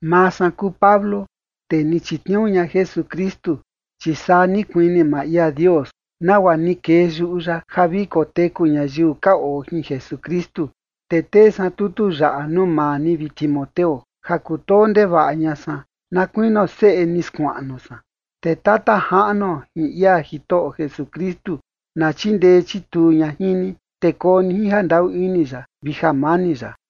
Maa san kuu Pablo, tee ni chitniuu ña Jesukristu, chi saa ni kuini maa ia Dios, nagua ni kee yuꞌu ya ja vi koteku ñayiu ka oo jin Jesukristu. Te tee san tutu yaꞌa nuu maa ni, vi Timoteo, ja kutoo ndevaꞌa ña san na kuinio seꞌe ni skuaꞌnu san. Te Tata Jaꞌnuo jin ia Jitoꞌo Jesukristu na chindee chituu ña jin ni, te koo ni jin jandaꞌu ini ya vi jamani ya.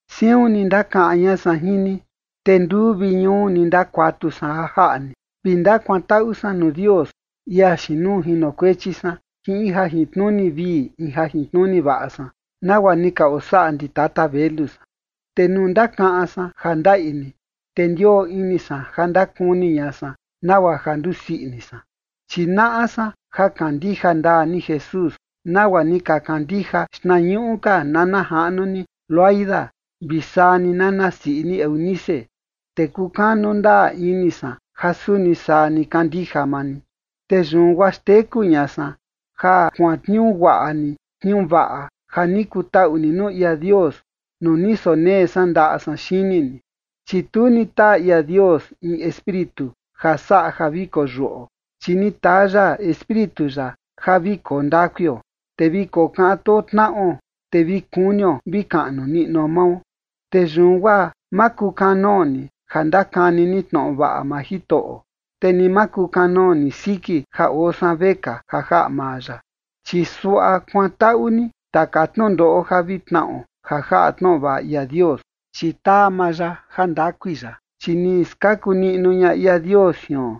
Siun ni ndakaꞌan ña san jin ni, te nduu vi ñuu ni ndakuatu san ja jaꞌa ni vi ndakuantaꞌu san nuu Dios, ia xiin nuu jinokuechi san jin in jajintnuni vii in jajintnuni vaꞌa san, nagua ni ka osaꞌa ndi tata velu san. Te nuu ndakaꞌan san ja ndaꞌi ni, te ndioo ini san ja ndakuni ña san nagua ja ndusii ini san. Chi naꞌa san ja kandija ndaa ni Jesús, nagua ni ka kandija xtnañuꞌu ka nana jaꞌnu ni Loida, vi saa ni nana siꞌi ni Eunice, te kukanu ndaa ini san ja suni saa ni kandija maa ni. Te yun guaa xteku ña san ja kuantniuu guaꞌa ni tniuu vaꞌa ja ni kutaꞌu ni nuu ia Dios nuu ni sonee san ndaꞌa san xini ni. Chi tu ni taa ia Dios in espíritu ja saꞌa ja vi koyuꞌo, chi ni taa ya Espíritu ya ja vi koo ndakuio, te vi kokaꞌan too tnaꞌo, te vi kunio vi kaꞌnu niꞌnuo mao. Te yun guaa ma kukanoo ni ja ndakani ni tnoꞌo vaꞌa maa Jitoꞌo, te ni ma kukanoo ni siki ja oo san vekaa ja jaꞌa maa ya. Chi suaꞌa kuantaꞌu ni taka tnundoꞌo ja vi tnaꞌo ja jaꞌa tnoꞌo vaꞌa ia Dios, chi taa maa ya jandakui ya. Chi ni skaku niꞌnu ña ia Dios jion,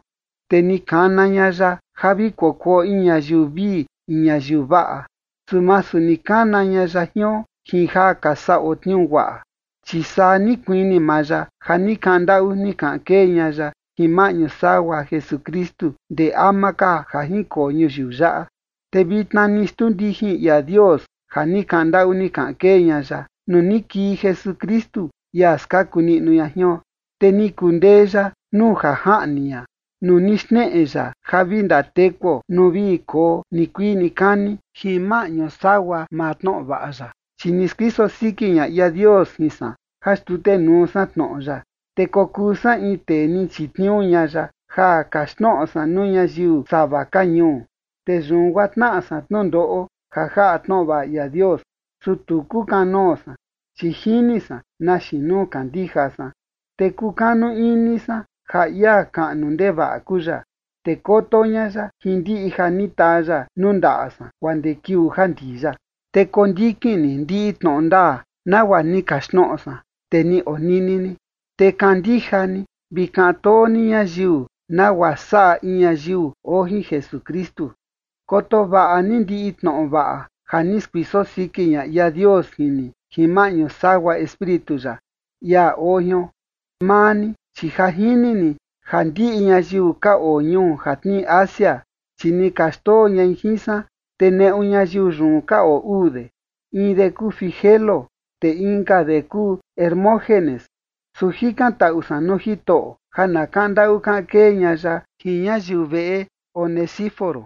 te ni kana ña ya ja vi kokuo in ñayiu vii in ñayiu vaꞌa. Su masu ni kana ña ya jion jin ja ka saꞌo tniuu guaꞌa, chi saa ni kuini maa ya ja ni kaꞌan ndaꞌu ni kaꞌan kee ña ya jin maꞌñu sagua Jesukristu ndee ama ka ja jinkoo ñuyiu yaꞌa. Te vitna ni xtuu ndijin ia Dios ja ni kaꞌan ndaꞌu ni kaꞌan kee ña ya nuu ni kii Jesukristu, ia skaku niꞌnu ña jion. Te ni kundee ya nuu jajaꞌni ña, nuu ni xneꞌe ya ja vi ndatekuo nuu vi koo nikuii nikani jin maꞌñu sagua maa tnoꞌo vaꞌa ya. Chi ni skuiso siki ña ia Dios jin san ja xtutenuu san tnoꞌo ya, te kokuu san in tee ni chitniuu ña ya ja kaxtnoꞌo san nuu ñayiu sava ka ñuu. Te yun guaa tnaꞌa san tnundoꞌo ja jaꞌa tnoꞌo vaꞌa ia Dios, su tu kukanoo san, chi jini san na xiin nuu kandija san. Te kukanu ini san ja ia kaꞌnu ndevaꞌa kuu ya, te koto ña ya jin ndiꞌi ja ni taa ya nuu ndaꞌa san guaa ndee kiuu ja ndii ya. Te kondikin ni ndiꞌi tnoꞌo ndaa nagua ni kaxtnoꞌo san, te ni onini ni. Te kandija ni vi kaꞌan too ni ñayiu, nagua saꞌa in ñayiu oo jin Jesukristu. Koto vaꞌa ni ndiꞌi tnoꞌo vaꞌa ja ni skuiso siki ña ia Dios jin ni jin maꞌñu sagua Espíritu ya, ia oo jion. Maa ni, chi ja jini ni ja ndiꞌi ñayiu ka oo ñuu ja tnii Asia, chi ni ka xndoo ñai jin san, te neꞌu ñayiu yun ka oo uu de, in de kuu Figelo, te inka de kuu Hermógenes. Su jikantaꞌu san nuu Jitoꞌo ja na kaꞌan ndaꞌu kaꞌan kee ña ya jin ñayiu veꞌe Onesíforo,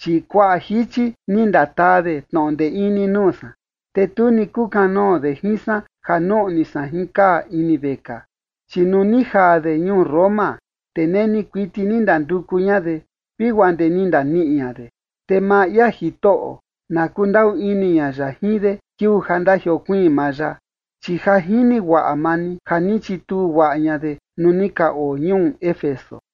chi kuaꞌa jichi ni ndataa de tnoꞌo ndee ini nuu san, te tu ni kukanoo de jin san ja nuꞌni san jin kaa ini vekaa. Chi nuu ni jaa de ñuu Roma, te neni kuiti ni ndanduku ña de, vi guaa ndee ni ndaniꞌi ña de. Te maa ia Jitoꞌo na kundaꞌu ini ña ya jin de kiuu ja ndajiokuiin maa ya. Chi ja jini guaꞌa maa ni ja ni chituu guaꞌa ña de nuu ni ka oo ñuu Éfeso.